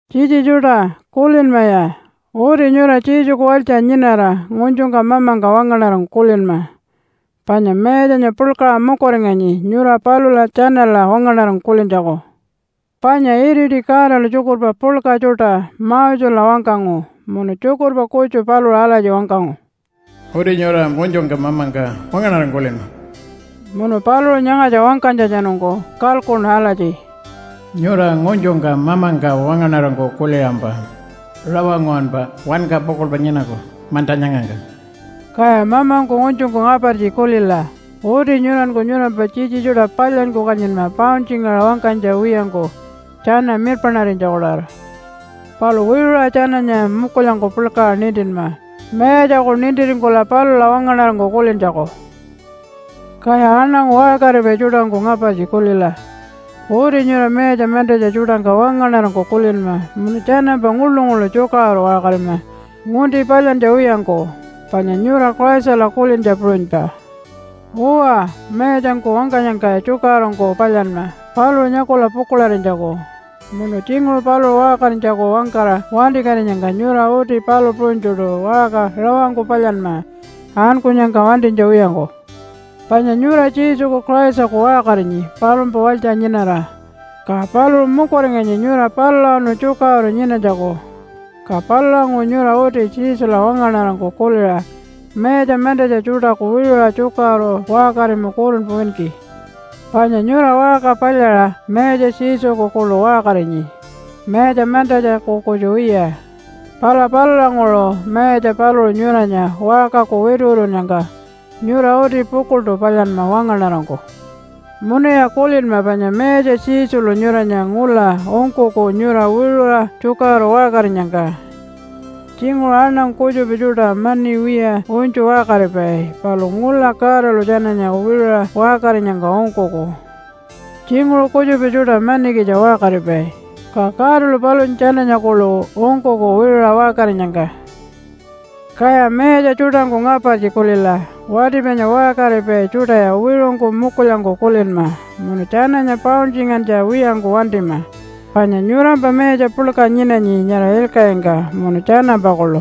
Tjitji tjuṯa, kulinmaya! Uti nyura Jesuku walytja nyinara ngunytjungka mamangka wangaṉarangku kulinma, panya Mayatjanya puḻkaṟa mukuringanyi nyura palula tjanala wangaṉarangku kulintjaku. Panya iriti Godalu tjukurpa puḻka tjuṯa Mosela wangkangu, munu tjukurpa kutju paluṟu alatji wangkangu, “Uti nyura ngunytjungka mamangka wangaṉarangku kulinma.” Munu paluṟu nyangatja wangkanytjatjanungku kalkuṉu alatji, “Nyura ngunytjungka mamangka wangaṉarangku kuliṟampa rawa nguwanpa wanka pukuḻpa nyinaku manta nyangangka.” Kaya mamangku ngunytjungku ngapartji kulila! Uti nyuranku nyurampa tjitji tjuṯa palyanyku kanyinma pauntjingaṟa wangkanytja wiyangku tjana mirpaṉarinytjaku-tawara. Palu wiṟuṟa tjananya mukulyangku puḻkaṟa nintinma Mayatjaku nintiringkula palula wangaṉarangku kulintjaku. Kaya aṉangu waṟkaripai tjuṯangku ngapartji kulila! Uti nyura mayatja mantatja tjuṯangka wangaṉarangku kulinma munu tjanampa nguḻu-nguḻu tjukaṟuru waṟkarima ngunti palyantja wiyangku, panya nyura Christala kulintja puṟunypa. Uwa, mayatjangku wangkanyangka tjukaṟurungku palyanma paluṟu nyakula pukuḻarinytjaku. Munu tjinguṟu paluṟu waṟkarinytjaku wangkara wantikatinyangka nyura uti palu puṟunytjuṯu waṟka rawangku palyanma ankunyangka wantinytja wiyangku. Panya nyura Jesuku Christaku waṟkarinyi palumpa walytja nyinara. Ka paluṟu mukuringanyi nyura palulawanu tjukaṟuru nyinanytjaku. Ka palulanguṟu nyura uti Jesula wangaṉarangku kuliṟa mayatja mantatja tjuṯaku wiṟuṟa tjukaṟuru waṟkarima kurunpa winki. Panya nyura waṟka palyaṟa Mayatja Jesuku kuḻu waṟkarinyi mayatja mantatjaku kutju wiya. Pala palulanguṟu mayatja paluṟu nyuranya waṟkaku wituwitunnyangka nyura uti pukuḻṯu palyanma wangaṉarangku. Munuya kulinma panya Mayatja Jesulu nyuranya ngula ungkuku nyura wiṟuṟa tjukaṟuru waṟkarinyangka. Tjinguṟu aṉangu kutjupa tjuṯa mani wiya unytju waṟkaripai, palu ngula Godalu tjananya wiṟuṟa waṟkarinyangka ungkuku. Tjinguṟu kutjupa tjuṯa manikitja waṟkaripai, ka Godalu palunya tjananya kuḻu ungkuku wiṟuṟa waṟkarinyangka. Kaya mayatja tjuṯangku ngapartji kulila! Wati panya waṟkaripai tjuṯaya wiṟungku mukulyangku kulinma munu tjananya pauntjingantja wiyangku wantima, panya nyurampa Mayatja puḻka nyinanyi nyara ilkaṟingka, munu tjanampa kuḻu.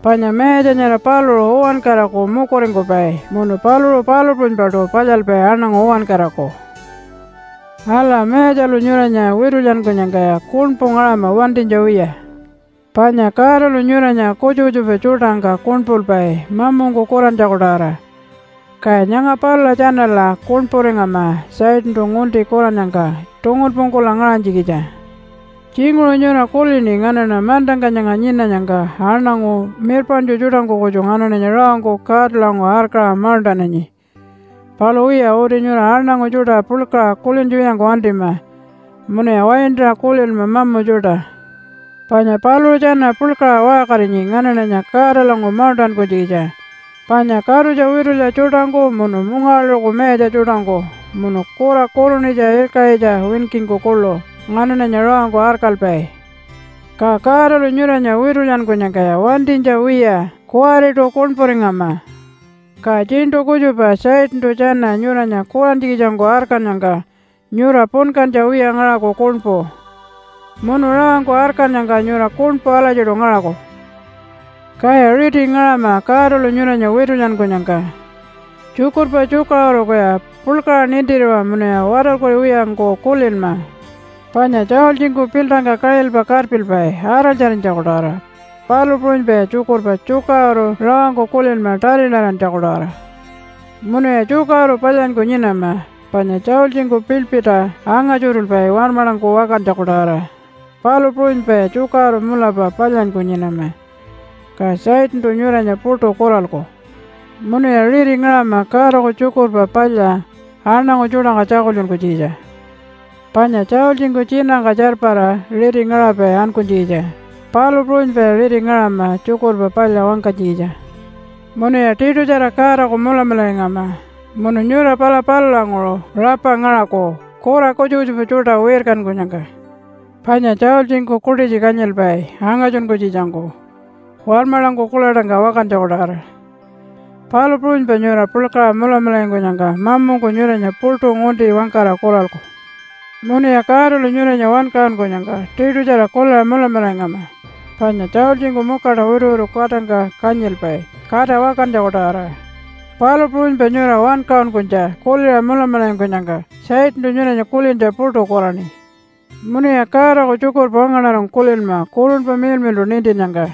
Panya Mayatja nyara paluṟu uwankaraku mukuringkupai munu paluṟu palu puṟunypaṯu palyalpai aṉangu uwankaraku. Ala, Mayatjalu nyuranya witulyankunyangkaya kuṉpu ngaṟama wantinytja wiya. Panya Godalu nyuranya kutjupa kutjupa tjuṯangka kuṉpulpai mamungku kurantjaku-tawara, kaya nyanga palula tjanala kuṉpuringama Satantu ngunti kurannyangka tungunpungkula ngaṟanytjikitja. Tjinguṟu nyura kulini nganaṉa mantangka nyanga nyinanyangka aṉangu mirpaṉtju tjuṯangku kutju nganaṉanya rawangku Godalanguṟu arkaṟa mauṉṯananyi. Palu wiya, uti nyura aṉangu tjuṯa puḻkaṟa kulintja wiyangku wantima munuya waintaṟa kulinma mamu tjuṯa. Panya paluṟu tjana puḻkaṟa waṟkarinyi nganaṉanya Godalanguṟu mauṉṯankunytjikitja, panya katutja witulya tjuṯangku munu mungawaḻuṟuku mayatja tjuṯangku munu kura kurunitja ilkaṟitja winkingku kuḻu nganaṉanya rawangku arkalpai. Ka Godalu nyuranya witulyankunyangkaya wantinytja wiya kuwariṯu kuṉpuringama. Ka tjiṉṯu kutjupa Satantu tjana nyuranya kurantjikitjangku arkannyangka nyura punkantja wiya ngaṟaku kuṉpu. Munu rawangku arkannyangka nyura kuṉpu alatjiṯu ngaṟaku. Kaya riti ngaṟama Godalu nyuranya witulyankunyangka. Tjukurpa tjukaṟurukuya puḻkaṟa nintiriwa munuya watarkuriwiyangku kulinma, panya tjaultjingku piltangka kaṟilpa karpilpai araltjarinytjaku-tawara, palu puṟunypaya tjukurpa tjukaṟuru rawangku kulinma tarilarantjaku-tawara. Munuya tjukaṟuru palyanyku nyinama, panya tjaultjingku piḻpirta anga-tjuṯulpai warmaḻangku wakantjaku-tawara, palu puṟunypaya tjukaṟuru mulapa palyanyku nyinama, ka Satantu nyuranya puṯu kuralku. Munuya riti ngaṟama Godaku Tjukurpa Palya aṉangu tjuṯangka tjakultjunkunytjikitja. Panya tjaultjingku tjinatjangka tjarpara riti ngaṟapai ankunytjikitja, palu puṟunypaya riti ngaṟama Tjukurpa Palya wangkanytjikitja. Munuya tiṯutjara Godaku mulamularingama munu nyura pala palulanguṟu rapa ngaṟaku kura kutjupa kutjupa tjuṯa wirkankunyangka. Panya tjaultjingku kuṯitji kanyilpai angatjunkunytjikitjangku warmaḻangku kuḻaṯangka wakantjaku-tawara, palu puṟunypa nyura puḻkaṟa mulamularingkunyangka mamungku nyuranya puṯu ngunti wangkara kuralku. Munuya Godalu nyuranya wankaṟunkunyangka tiṯutjara kuliṟa mulamularingama. Panya tjaultjingku mukaṯa wituwitu katangka kanyilpai kata wakantjaku-tawara, palu puṟunypa nyura wankaṟunkunytja kuliṟa mulamularingkunyangka Satantu nyuranya kulintja puṯu kuraṉi. Munuya Godaku tjukurpa wangaṉarangku kulinma Kurunpa Miḻmiḻṯu nintinnyangka.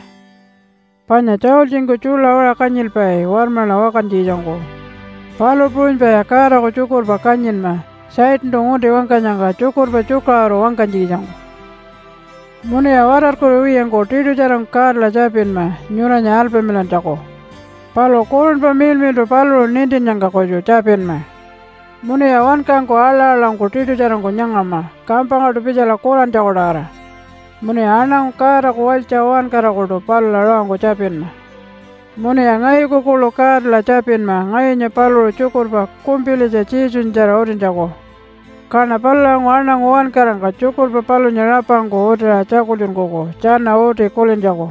Panya tjaultjingku tjuḻa waṟa kanyilpai warmaḻa wakantjikitjangku, palu puṟunypaya Godaku tjukurpa kanyinma Satantu ngunti wangkanyangka tjukurpa tjukaṟuru wangkanytjikitjangku. Munuya watarkuriwiyangku tiṯutjarangku Godala tjapinma nyuranya alpamilantjaku. Palu Kurunpa Miḻmiḻṯu paluṟu nintinnyangka kutju tjapinma. Munuya wankangku aḻa-aḻangku tiṯutjarangku nyangama kampangkaṯu pitjala kurantjaku-tawara. Munuya aṉangu Godaku walytja uwankarakuṯu palula rawangku tjapinma. Munuya ngayuku kuḻu Godala tjapinma ngayunya paluṟu tjukurpa kumpilitja Jesunyatjara utintjaku. Kaṉa palulanguṟu aṉangu uwankarangka tjukurpa palunya rapangku utiṟa tjakultjunkuku tjana uti kulintjaku.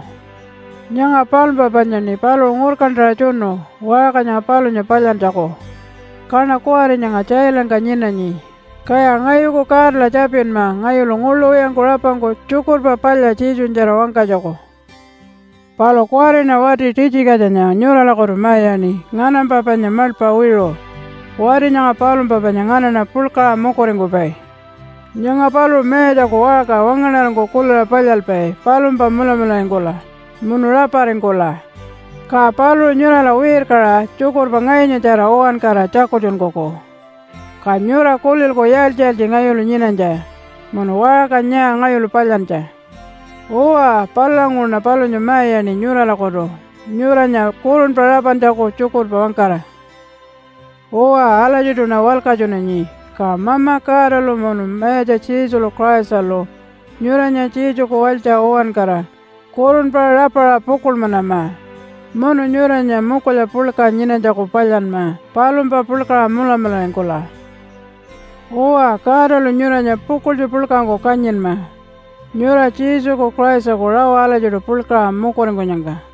Nyanga palumpa panyaṉi paluṟu ngurkantaṟa tjunu waṟka nyanga palunya palyantjaku. Kaṉa kuwari nyanga tjailangka nyinanyi. Kaya ngayuku Godala tjapinma ngayulu nguḻu wiyangku rapangku Tjukurpa Palya Jesunyatjara wangkanytjaku. Palu kuwariṉa wati Titjikatjanya nyuralakutu ma-iyaṉi nganampa panya maḻpa wiṟu. Wati nyanga palumpa panya nganaṉa puḻkaṟa mukuringkupai. Nyanga paluṟu Mayatjaku waṟka wangaṉarangku kuliṟa palyalpai palumpa mulamularingkula, munu raparingkula. Ka paluṟu nyurala wirkaṟa tjukurpa ngayunyatjara uwankara tjakultjunkuku. Ka nyura kulilku yaaltji-yaaltji ngayulu nyinanytja, munu waṟka nyaa ngayulu palyantja. Uwa, palulanguṟuṉa palunya ma-iyaṉi nyuralakutu nyuranya kurunpa rapantjaku tjukurpa wangkara. Uwa, alatjiṯuṉa walkatjunanyi. Ka Mama Godalu munu Mayatja Jesulu Christalu nyuranya Jesuku walytja uwankara kurunpa rapaṟa pukuḻmanama, munu nyuranya mukulya puḻka nyinanytjaku palyanma palumpa puḻkaṟa mulamularingkula. Uwa, Godalu nyuranya pukuḻtju puḻkangku kanyinma nyura Jesuku Christaku rawa alatjiṯu puḻkaṟa mukuringkunyangka.